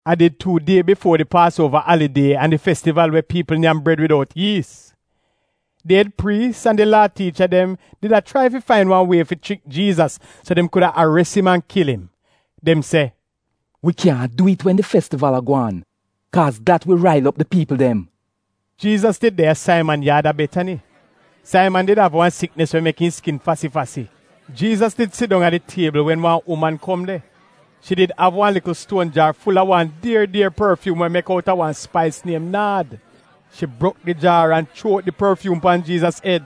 A did tuu die bifuo di Paasuova alidie an di Festival we piipl nyam bred widout iis. Di ed priis an di Laa tiicha dem did a chrai fain wan wie fi chrik Jiizas so dem kuda ares im an kil im. Dem se, “Wi kyaahn dwi'it wen di festival a gwaan, kaaz dat wi rail op di piipl dem.” Jiizas did de a Saiman yaad a Betani. Saiman did av wan siknis we mek im skin fasi-fasi. Jiizas did sidong a di tiebl wen wan uman kom de. Shi did av wan likl stuon jaar ful-a wan dier dier porfyuum wa mek outa wan spais niem naad. Shi brok di jaar an chuo out di porfyuum pan Jiizas ed.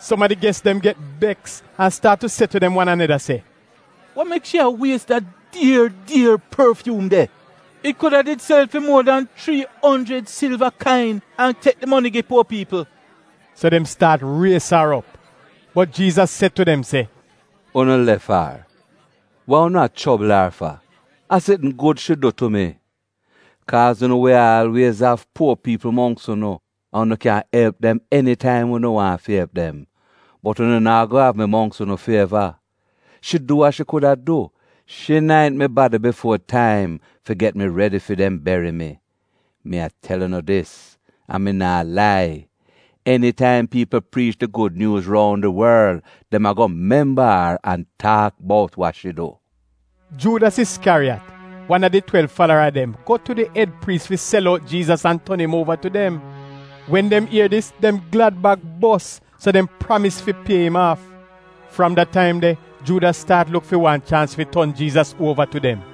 Som a di ges dem get beks, an staat se tu dem wan aneda se, “Wa mek shi a wies da dier dier porfyuum de? It kuda did sel fi muo dan chrii onjrid silva kain an tek di moni gi puo piipl!” So dem staat ries ar op. Bot Jiizas se tu dem se: “Unu lef ar! Wa unu a chobl ar fa? A sitn gud shi du tu mi. Kaaz unu wi aalwiez av puo piipl mongks unu an unu kyan elp dem enitaim unu waahn fi elp dem. Bot unu naa go av mi mongks unu fi eva. Shi du wa shi kuda du. Shi naint mi badi bifuo taim fi get mi redi fi dem beri mi. Mi a tel unu dis, an mi naa lai, enitaim piipl priich di Gud Nyuuz roun di worl, dem ago memba ar an taak bout wa shi du.” Juudas Iskyariyat, wan a di twelv falara dem, go tu di ed priis fi sel out Jiizas an ton im uova tu dem. Wen dem ier dis dem glad-bag bos, so dem pramis fi pie im aaf. Fram da taim de, Juudas staat luk fi wan chaans fi ton Jiizas uova tu dem.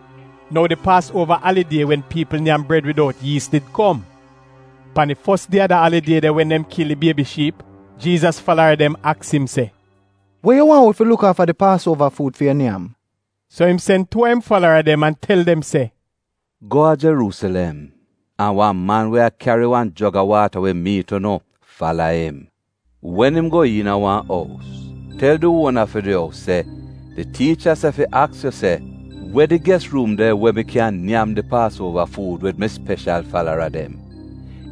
Nou di Paasuova alidie wen piipl nyam bred widout yiis did kom. Pan di fos die a da alidie de wen dem kil di biebi shiip, Jiizas falara dem aks im se, “We yu waahn wi fi luk aafa di Paasuova fuud fi yu nyam?” So im sen tuu a im falara dem an tel dem se “Go a Jeruusilem, an wan man we a kyari wan jog a waata wi miit unu. Fala im. Wen im go iina wan ous, tel di uona fi di ous se, ‘Di tiicha se fi aks yu se: We di ges ruum de we im kyan nyam di Paasuova fuud wid mi speshal falara dem?’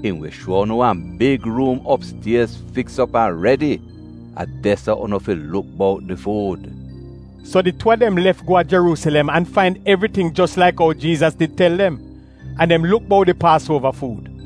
Im wi shuo unu wan big ruum opstiez fiks op an redi. A de-so unu fi luk bout di fuud.” So di tuu a dem lef go a Jeruusilem an fain evriting jos laik ou Jiizas did tel dem. An dem luk bout di Paasuova fuud.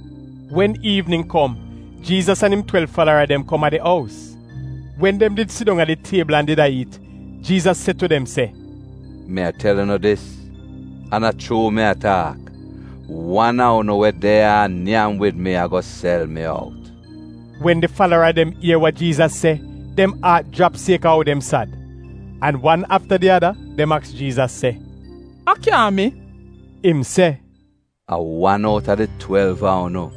Wen iivnin kom Jiizas an im twelv falara dem kom a di ous. Wen dem did sidong a di tiebl did a iit, Jiizas se tu dem se, “Mi a tel unu dis, an a chuu mi a taak, wan a unu we de ya a nyam wid mi ago sel mi out.” Wen di falara dem ier wa Jiizas se, dem aat jrap sieka ou dem sad. An wan afta di ada dem aks Jiizas se, “A kyaahn mi?” Im se, “A wan outa di twelv a unu,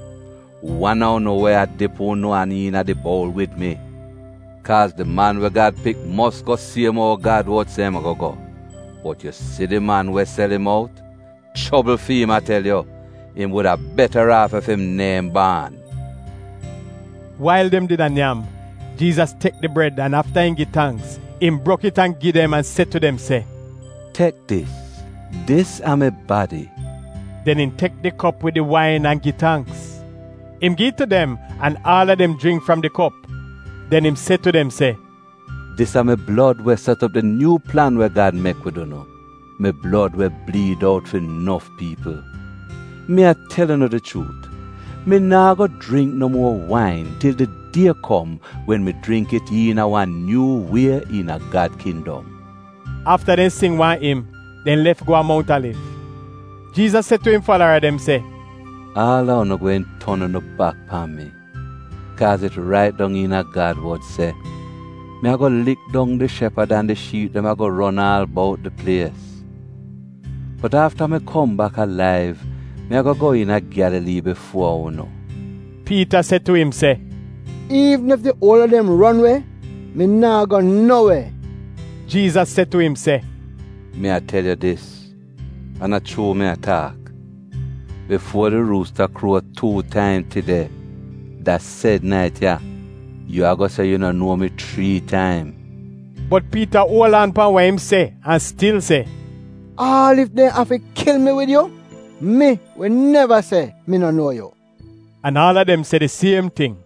wan a unu we a dip unu an iina di boul wid mi. Kaaz di Man we Gad Pik mos go siem ou Gad wod se im ago go, bot yu si di man we sel im out — chobl fi'im a tel yu! Im wuda betaraaf ef im neehn baan.” Wail dem did a nyam, Jiizas tek di bred an aafa im gi tangks, im brok it an gi dem an se tu dem se, “Tek dis. Dis a mi badi.” Den im tek di kop wid di wain an gi tangks. Im gi it tu dem, an aal a dem jringk fram di kop. Den im se tu dem se, “Dis a mi blod we set op di nyuu plan we Gad mek wid unu, mi blod we bliid out fi nof piipl. Mi a tel unu di chuut, mi naa go jringk no muor wain til di die kom wen mi jringk it iina wan nyuu wie iina Gad kindom.” Afta dem sing wan im dem lef go a Mount Aliv. Jiizas se tu im falara dem se, “Aal a unu gweehn ton unu bak pan mi, kaaz it rait dong iina Gad wod se, “ ‘Mi ago lik dong di shepad, an di shiip dem ago ron aal bout di plies.’ Bot afta mi kom bak alaiv, mi ago go iina Gyalalii bifuo unu.” Piita se tu im se, “Iivn ef di uol a dem ron we, mi naa go no we!” Jiizas se tu im se, “Mi a tel yu dis an a chuu mi a taak, bifuo di ruusta kruo tuu taim tide — da sed nait ya — yu ago se yu no nuo mi chrii taim.” Bot Piita uol aan pan wa im se an stil se, “Aal ef dem afi kil mi wid yu, mi wi neva se mi no nuo yu!” An aal a dem se di siem ting.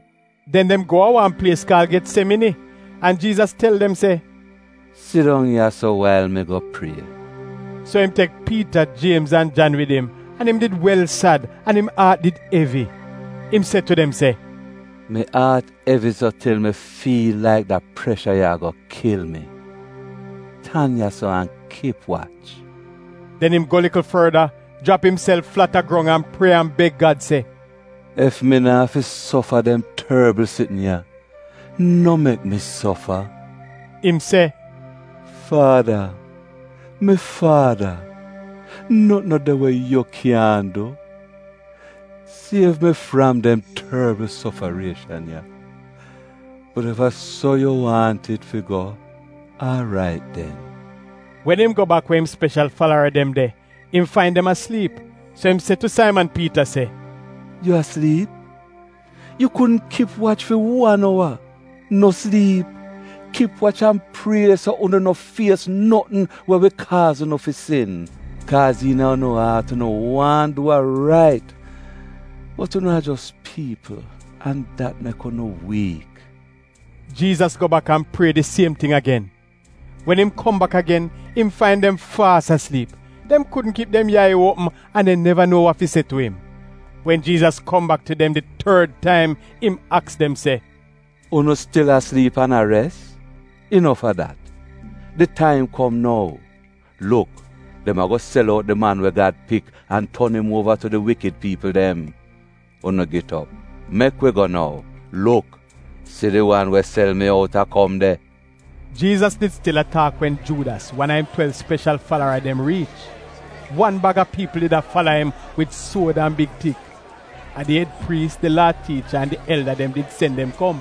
Den dem go a wan plies kaal Getsemini, an Jiizas tel dem se, “Sidong ya-so wail mi go prie.” So im tek Piita, Jiemz an Jan wid im an im did wel sad an im aat did evi. Im se tu dem se, “Mi aat evi so til mi fiil laik da presha ya ago kil mi. Tan ya-so an kip wach.” Den im go likl forda, jrap imself flat a grong an prie an beg Gad se, “Ef im no afi sofa dem torbl sitn ya, no mek mi sofa.” Im se, “Faada, mi faada, notn no de we yu kyaahn du. Siev mi fram dem torbl sofarieshan ya! Bot ef a so yu waahn it fi go, aarait den.” Wen im go bak we im speshal falara dem de im fain dem a sliip, so im se tu Saiman Piita se, “Yu a sliip? Yu kudn kip wach fi wan owa? No sliip! Kip wach an prie so unu no fies notn we wi kaaz unu fi sin. Kaaz iina unu aat unu waahn du wa rait bot unu a jos piipl an dat mek unu wiik.” Jiizas go bak an prie di siem ting agen. Wen im kom bak agen, im fain dem faas a sliip; dem kudn kip dem yai opm an dem neva nuo wa fi se tu im. Wen Jiizas kom bak tu dem di tord taim, im aks dem se, “Unu stil a sliip an a res? Inof a dat! Di taim kom nou. Luk! Dem ago sel out di Man we Gad pik an ton im uova tu di wikid piipl dem. Unu git op! Mek wi go nou. Luk! Si di wan we sel mi out a kom de.” Jiizas did stil a taak wen Juudas, wan a im twelv speshal falara dem riich. Wan bag a piipl did a fala im wid suod an big tik. A di ed priis, di Laa tiicha, an di elda dem did sen dem kom.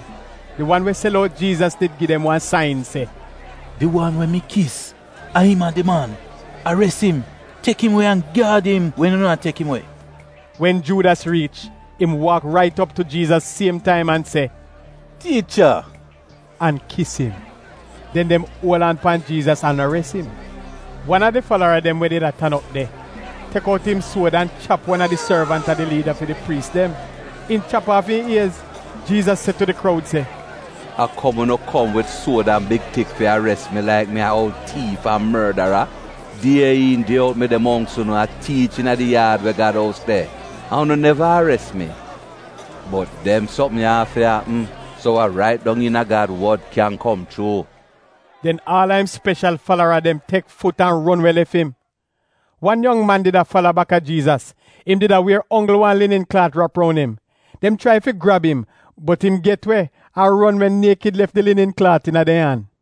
(Di wan we sel out Jiizas did gi dem wan sain se, “Di wan we mi kis a im a di man. Ares im, tek im we an gyaad im wen unu a tek im we.”) Wen Juudas riich im waak rait op tu Jiizas siem taim an se, “Tiicha!” an kis im. Den dem uol aan pan Jiizas an ares im. Wan a di falara dem we did a tan op de, tek out im suod an chap wan a di sorvant a di liida fi di priis dem. Im chap aaf im iez. Jiizas se tu di kroud se, “A kom unu kom wid suod an big tik fi ares mi laik mi a oul tiif an mordara? Die iin die out mi de mongks unu a tiich iina di yaad we Gad ous de, an unu neva ares mi. Bot dem sopm ya afi apm so wa rait dong iina Gad wod kyan kom chuu.” Den aal a im speshal falara dem tek fut an ron we lef im. Wan yong man did a fala baka Jiizas. Im did a wier onggl wan linin klaat rap roun im. Dem chrai fi grab im, bot im get we an ron we niekid lef di linin klaat iina dem an.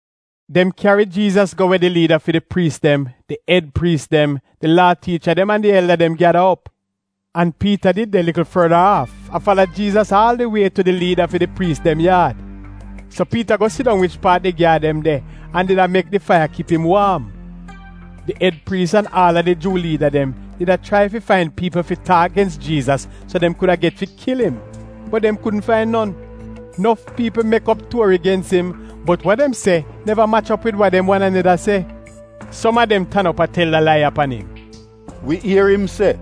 Dem kyari Jiizas go we di liida fi di priis dem, di ed priis dem, di Laa tiicha dem, an di elda dem gyada op. An Piita did de likl forda aaf a fala Jiizas aal di wie tu di liida fi di priis dem yaad. So Piita go sidong wich paat di gyaad dem de a did a mek di faiya kip im waam. Di ed priis an aal a di Juu liida dem di a chrai fi fain piipl fi taak gens Jiizas, so dem kuda get fi kil im, bot dem kudn fain non. Nof piipl mek op tuori gens im, bot wa dem se neva mach op wid wa dem wan aneda se. Som a dem tan op a tel da lai ya pan im: “Wi ier im se,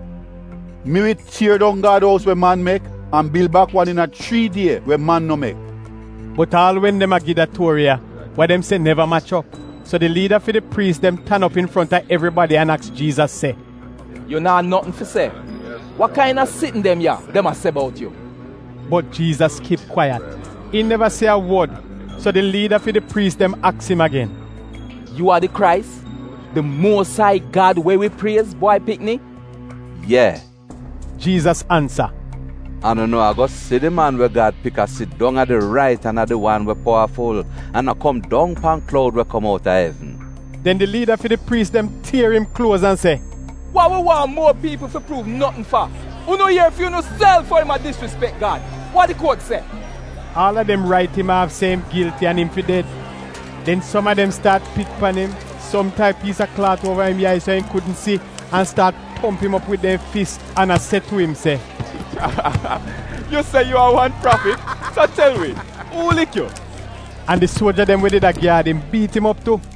‘Mi wi tier dong Gad ous we man mek an bil bak wan iina chrii die we man no mek.’” Bot aal wen dem a gi da tuori ya, wa dem se neva mach op. So di liida fi di priis dem tan op infronta evribadi an aks Jiizas se, “Yu naa notn fi se? Wa kaina sitn dem ya dem a se bout yu?” Bot Jiizas kip kwaiyat. Im neva se a wod. So di liida fi di priis dem aks im agen, “Yu a di Krais, di Muos Ai Gad we wi priez Bwai Pikni?” “Ye!” Jiizas ansa, “An unu ago si di Man we Gad Pik a sidong a di rait an a di wan we powaful, an a kom dong pan kloud we kom out a evn.” Den di liida fi di priis dem tier im kluoz an se, “Wa wi waahn muo piipl fi pruuv notn fa? Unu ier fi unuself ou im a disrispek Gad. Wa di kuot se?” Aal a dem rait im aaf se im gilti an im fi ded. Den som a dem staat pit pan im, som tai piis a klaat uova im yai so im kudn si an staat tomp im op wid dem fis an a se tu im se, “Yu se yu a wan prafit, so tel wi uu laik yu.” An di suoja dem we did a gyaad im biit im op tu.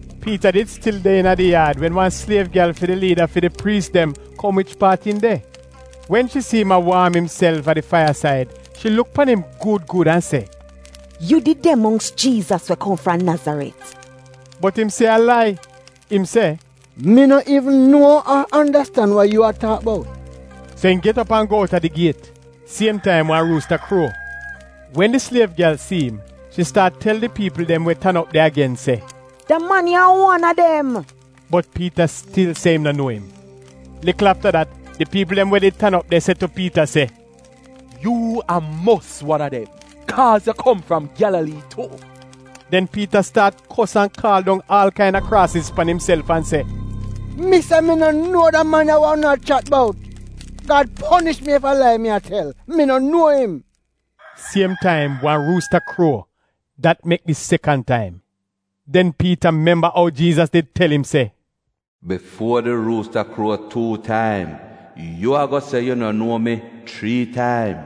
Piita did stil de iina di yaad wen wan sliev gyal fi di liida fi di priis dem kom wich paat im de. Wen shi si im a waam imself a di faiyasaid, shi luk pan im gud gud an se, “Yu did de mongks Jiizas we kom fram Nazaret.” Bot im se a lai. Im se, “Mi no iivn nuo ar andastan wa yu a taak bout!” So im get op an go outa di giet. Siem taim wan ruusta kruo. Wen di sliev gyal si im shi staat tel di piipl dem we did tan op de agen se, “Da man ya a wan a dem!” Bot Piita stil se im no nuo im. Likl afta dat di piipl dem we did tan op de se tu Piita se, “Yu a mos wan a dem, kaaz yu kom fram Gyalalii tu.” Den Piita staat kos an kaal dong aal kaina kraasiz pan imself an se, “Mi se mi no nuo da man ya wa unu a chat bout! Gad ponish mi ef a lai mi a tel! Mi no nuo im!” Siem taim wan ruusta kruo, dat mek di sekan taim. Den Piita memba ou Jiizas did tel im se, “Bifuo di ruusta kruo tuu taim, yu ago se yu no nuo mi chrii taim.”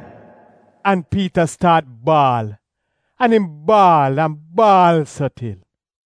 An Piita staat baal, an im baal an baal so til.